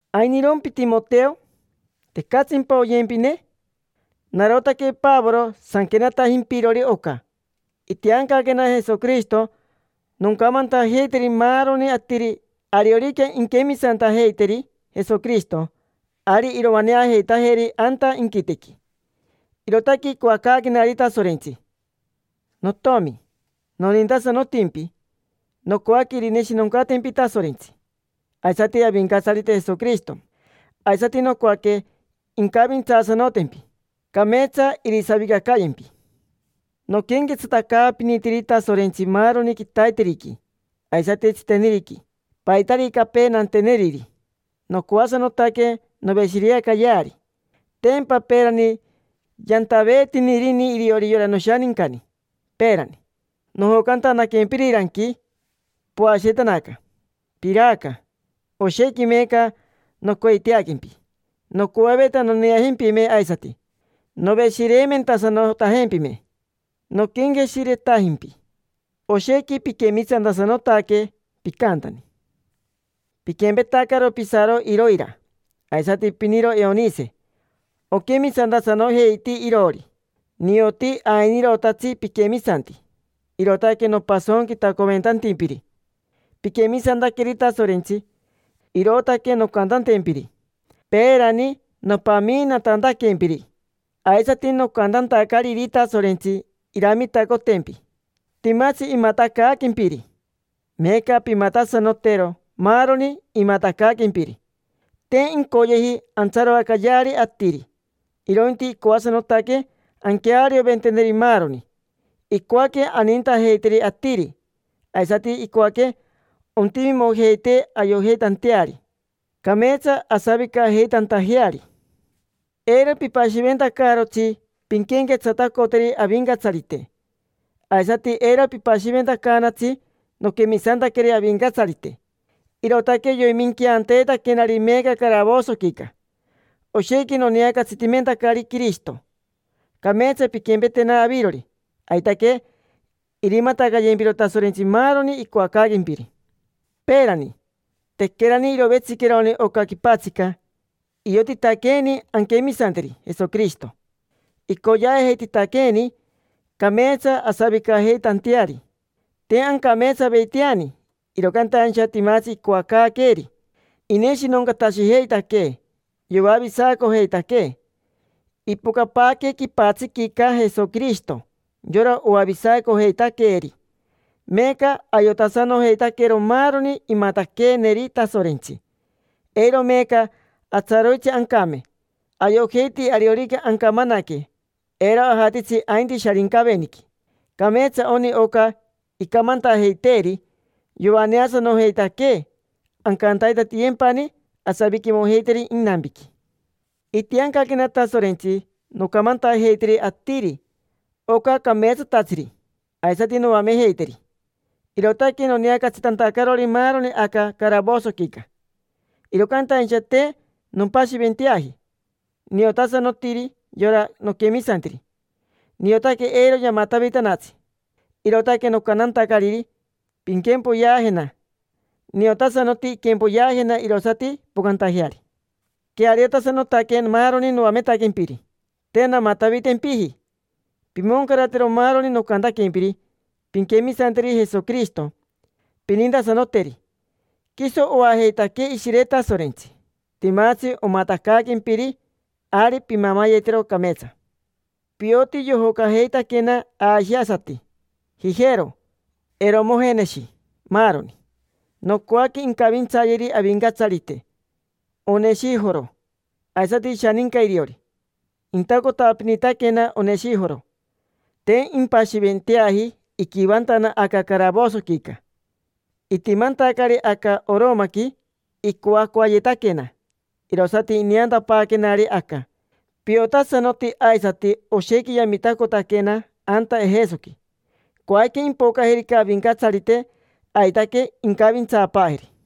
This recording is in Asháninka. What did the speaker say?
¿Ainirompi, Timoteo? ¿Tecatsimpa oyempine? Narotaque Pavoro sanquenatajimpirori oca. Itiancaquena Jesoquirishito noncamantajeiteri maaroni atiri ariorica inquemisantajeiteri Jesoquirishito, ari iroaneajeitajeri anta inquitequi. Irootaque icoacaaquenari Tasorentsi. Notiomi, nonintasanotimpi. Nocoaque irineshinoncatempi Tasorentsi, aisati Avincatsarite Jesoquirishito. Aisati nocoaque incavintsaasanotempi, cameetsa irisavicacayempi. Noquenquetsatacaapinitiri Tasorentsi maaroni quitaiteriqui, aisati tsiteniriqui. Paitaricapee nanteneriri, nocoasanotaque noveshireacayeari. Tempa peerani yantaveetinirini iriori yora noshanincani. Peerani, nojocantanaquempiriranqui, poashiretanaca, piraaca. Oshequi meeca nocoiteaquempi. Nocoaveta noneajempime aisati, noveshireimentasanotajempime. Noquenqueshiretajimpi, oshequi piquemisantasanotaque, picantani. Piquempetacaro pisaro Iroira, aisati piniro Eonise: oquemisantasanojeiti iroori. Nioti ainirotatsi piquemisanti, irootaque nopasonquitacoventantimpiri. Piquemisantaqueri Tasorentsi, irootaque noncantantempiri: peerani, nopamiinatantaquempiri, aisati nocantantacariri Tasorentsi iramitacotempi, timatsi imatacaaquempiri. Meeca pimatasanotero maaroni imatacaaquempiri. Te incoyeji antsaroacayeari atiri, irointi icoasanotaque anquearioventeneri maaroni. Icoaque anintajeiteri atiri; aisati icoaque ontimimojeitee ayojeitanteari, cameetsa asavicajeitantajeari. Eiro pipashiventacaarotsi pinquenquetsatacoteri Avincatsarite. Aisati, eiro pipashiventacaanatsi; noquemisantaqueri Avincatsarite, irootaque yoiminqueanteetaquenari meeca caravosoquica. Oshequi noneacatsitimentacari Quirishito, cameetsa pinquempetena avirori. Aitaque irimatacayempiro Tasorentsi maaroni icoacaaquempiri. Peerani, tequerani irovetsiqueroni oca quipatsica, iotitaqueeni anquemisanteri Jesoquirishito. Icoyeajeititaqueeni cameetsa asavicajeitanteari. Te ancameetsaveiteani, iro cantaincha timatsi icoacaaqueeri. Ineshinoncatashijeitaquee, yoavisacojeitaquee. Ipocapaaque quipatsiquica Jesoquirishito, yora oavisacojeitaqueeri. Meeca ayotasanojeitaquero maaroni imataqueeneri Tasorentsi. Eiro meeca atsaroitsi ancame. Ayojeiti ariorica ancamanaque, eiro ajatitsi ainti Sharincaveniqui. Cameetsa oni oca icamantajeiteeri: yoaneasanojeitaquee, ancantaitatiyempani asaviquimojeiteri inampiqui. Itiancaquena Tasorentsi noncamantajeiteri atiri oca cameetsatatsiri, aisati noamejeiteri. Irootaque noneacatsitantacarori maaroni aca caravosoquica. Iro cantaincha te nompashiventeaji. Niotasanotiri yora noquemisantiri: niotaque eiro yamatavitanatsi, irootaque nocantantacariri: “Pinquempoyeajena”. Niotasanoti inquempoyeajena irosati impocantajeari. Queariotasanotaque maaroni noametaquempiri, te namatavitempiji. Pimoncaratero maaroni nocantaquempiri. Pinquemisanteri Jesoquirishito, pinintasanoteri. Quiso oajeitaquee Ishire Tasorentsi. Timatsi omatacaaquempiri, ari pimamayetero cameetsa. Pioti yojocajeitaquena ashiasati: Jijero, Eromojeneshi, maaroni. Nocoaque incavintsayeri Avincatsarite Oneshijoro, aisati ishaninca iriori. Intacotapinitaquena Oneshijoro, te impashiventeaji iquivantana aca caravosoquica. Itimantacari aca Oromaqui, icoacoayetaquena, irosati ineantapaaquenari aca. Piotasanoti aisati oshequi yamitacotaquena anta Ejesoqui. Coajica, impocajerica Avincatsarite, aitaque incavintsaapaajeri.